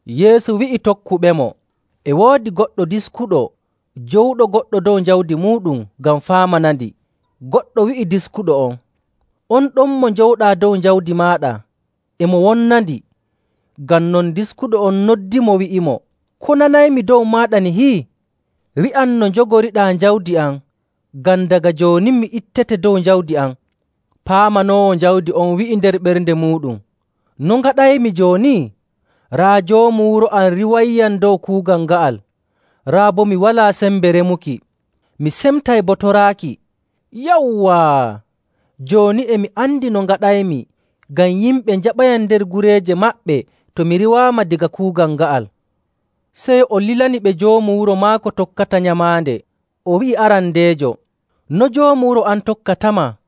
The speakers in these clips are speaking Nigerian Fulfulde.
Yeesu wi'i tokkuɓemo, “E woodi goɗɗo diskuɗo jowuɗo goɗɗo dow jawdi muuɗum ngam faamanandi. Goɗɗo wi'i diskuɗo on, ‘On ɗon mo njowɗaa dow jawdi maaɗa e mo wonnandi.’ Ngam non diskuɗo on noddimo, wi'imo, ‘Ko nanaymi dow maaɗa nihi? Wi'am no njogoriɗaa jawdi am ngam daga jooni mi ittete dow jawdi am.’ Paamanoowo jawdi on wi'i nder ɓernde muuɗum, ‘No ngaɗaymi jooni? Raa joomu wuro am riiwayyam dow kuugal nga'al, raa boo mi walaa sembe remuki, mi semtay boo toraaki. Yawwaa! Jooni e mi andi no ngaɗaymi ngam yimɓe njaɓayam nder gureeje maɓɓe to mi riiwaama daga kuugal nga'al.’ Sey o lilani ɓe joomu wuro maako tokkata nyamaande, o wi'i arandeejo, ‘No joomu wuro am tokkatama?’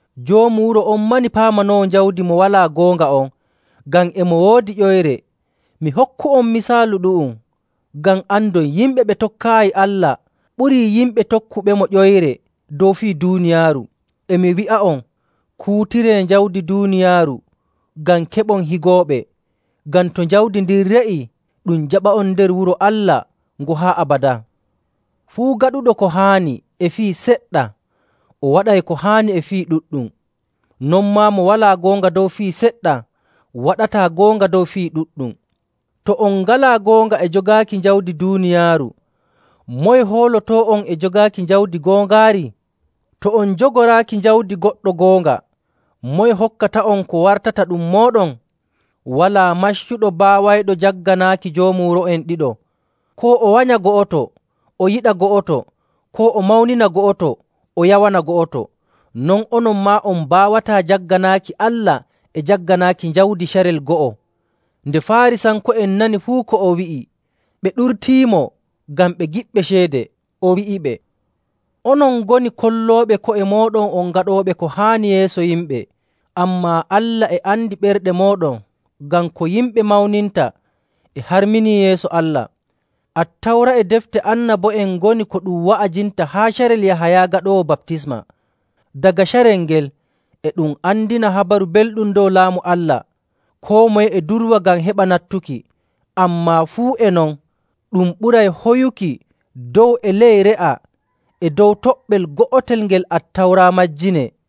Joomu wuro on mani paamanoowo jawdi mo walaa goonga on, ngam e mo woodi ƴoyre. Mi hokku'on misaalu ɗu'um ngam andon yimɓe ɓe tokkaayi Allah ɓurii yimɓe tokkuɓemo ƴoyre dow fii duuniyaaru. “E mi wi'a'on, kuutiree jawdi duuniyaaru ngam keɓon higooɓe, ngam to jawdi ndin re'ii, ɗum jaɓa'on nder wuro Allah ngo haa abadaa. Fuu gaɗuɗo ko haani e fii seɗɗa, o waɗay ko haani e fii ɗuɗɗum. Non maa mo walaa goonga dow fii seɗɗa waɗataa goonga dow fii ɗuɗɗum. To on ngalaa goonga e jogaaki jawdi duuniyaaru, moye hoolotoo'on e jogaaki jawdi goongaari? To on njogoraaki jawdi goɗɗo goonga, moye hokkata'on ko wartata ɗum mooɗon? “Walaa maccuɗo baawayɗo jagganaaki joomu wuro'en ɗiɗo. Koo o wanya go'oto o yiɗa go'oto, koo o mawnina go'oto o yawana go'oto. Non onon maa on mbaawataa jagganaaki Allah e jagganaaki jawdi carel go'o.”. Nde Faarisanko'en nani fuu ko o wi'i, ɓe ɗurtiimo ngam ɓe giɗɓe ceede. O wi'iɓe, “Onon ngoni kollooɓe ko'e mooɗon on gaɗooɓe ko haani yeeso yimɓe, ammaa Allah e andi ɓerɗe mooɗon. Ngam ko yimɓe mawninta e harmini yeeso Allah. “Attawra e Defte Annabo'en ngoni ko ɗum wa'ajinta haa carel Yahaya Gaɗoowo Baptisma. Daga carel ngel, e ɗum andina Habaru Belɗum dow Laamu Allah, koo moye e durwa ngam heɓa nattuki.. Ammaa fuu e non, ɗum ɓuray hoyuki dow e ley re'a e dow toɓɓel go'el ngel Attawra majjinee..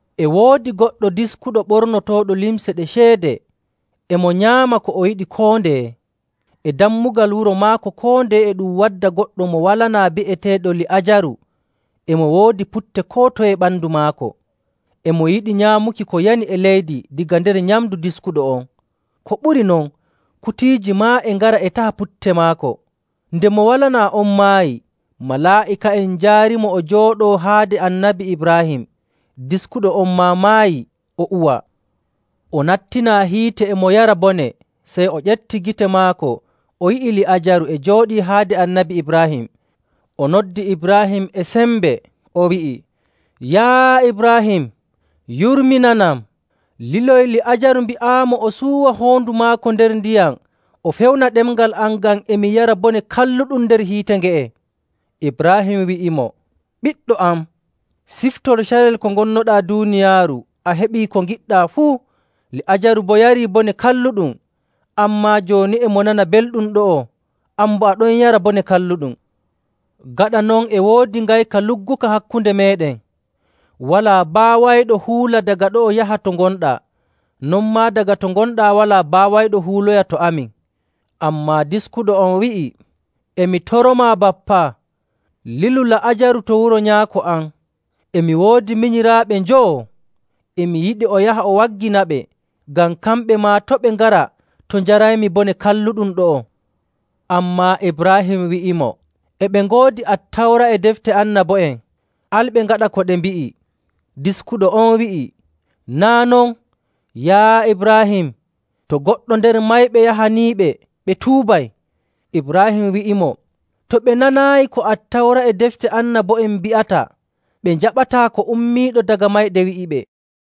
“E woodi goɗɗo diskuɗo ɓornotooɗo limce ɗe ceede, e mo nyaama ko o yiɗi koo ndeye. E dammugal wuro maako koo ndeye e ɗum wadda goɗɗo mo walanaa bi'eteeɗo Li'aajaru e mo woodi putte koo toye e ɓandu maako. E mo yiɗi nyaamuki ko yani e leydi daga nder nyamndu diskuɗo on. Ko ɓuri non, kutiiji maa e ngara e taha putte maako. Nde mo walanaa on maayi, malaa'ika'en njaarimo o jooɗoo haade Annabi Ibraahim. Diskuɗo on maa maayi o uwaa. O nattinaa hiite e mo yara bone, sey o ƴefti gite maako, o yi'i Li'aajaru e jooɗii haade Annabi Ibraahim. O noddi Ibraahim e sembe, o wi'i, ‘Yaa Ibraahim, yurminanam, liloy Li'aajaru mbi'aamo o suuwa hoondu maako nder ndiyam o fewna ɗemngal am ngam e mi yara bone kalluɗum nder hiite nge'e.’ Ibraahim wi'imo, ‘Ɓiɗɗo am, siftor carel ko ngonnoɗaa duuniyaaru a heɓii ko ngiɗɗaa fuu, Li'aajaru boo yarii bone kalluɗum. Ammaa jooni e mo nana belɗum ɗo'o, an boo a ɗon yara bone kalluɗum. Gaɗa non, e woodi ngayka lugguka hakkunde meeɗen. Walaa baawayɗo huula daga ɗo'o yaha to ngonɗaa, non maa daga to ngonɗaa walaa baawayɗo huuloya to amin.’ Ammaa diskuɗo on wi'i, ‘E mi toromaa, Bappa, lilu Li'aajaru to wuro nyaako am. E mi woodi minyiraaɓe njowo, e mi yiɗi o yaha o wagginaɓe ngam kamɓe maa to' ɓe ngara to njaraymi bone kalluɗum ɗo'o.’ Ammaa Ibraahim wi'imo, ‘E ɓe ngoodi Attawra e Defte Annabo'en, al ɓe ngaɗa ko ɗe mbi'i.’ Diskuɗo on wi'i, ‘Naa' non, yaa Ibraahim, to goɗɗo nder mayɓe yahaniiɓe, ɓe tuubay.’ Ibraahim wi'imo, ‘To ɓe nanaayi ko Attawra e Defte Annabo'en mbi'ata, ɓe njaɓataa ko ummiiɗo daga mayde wi'iɓe.’”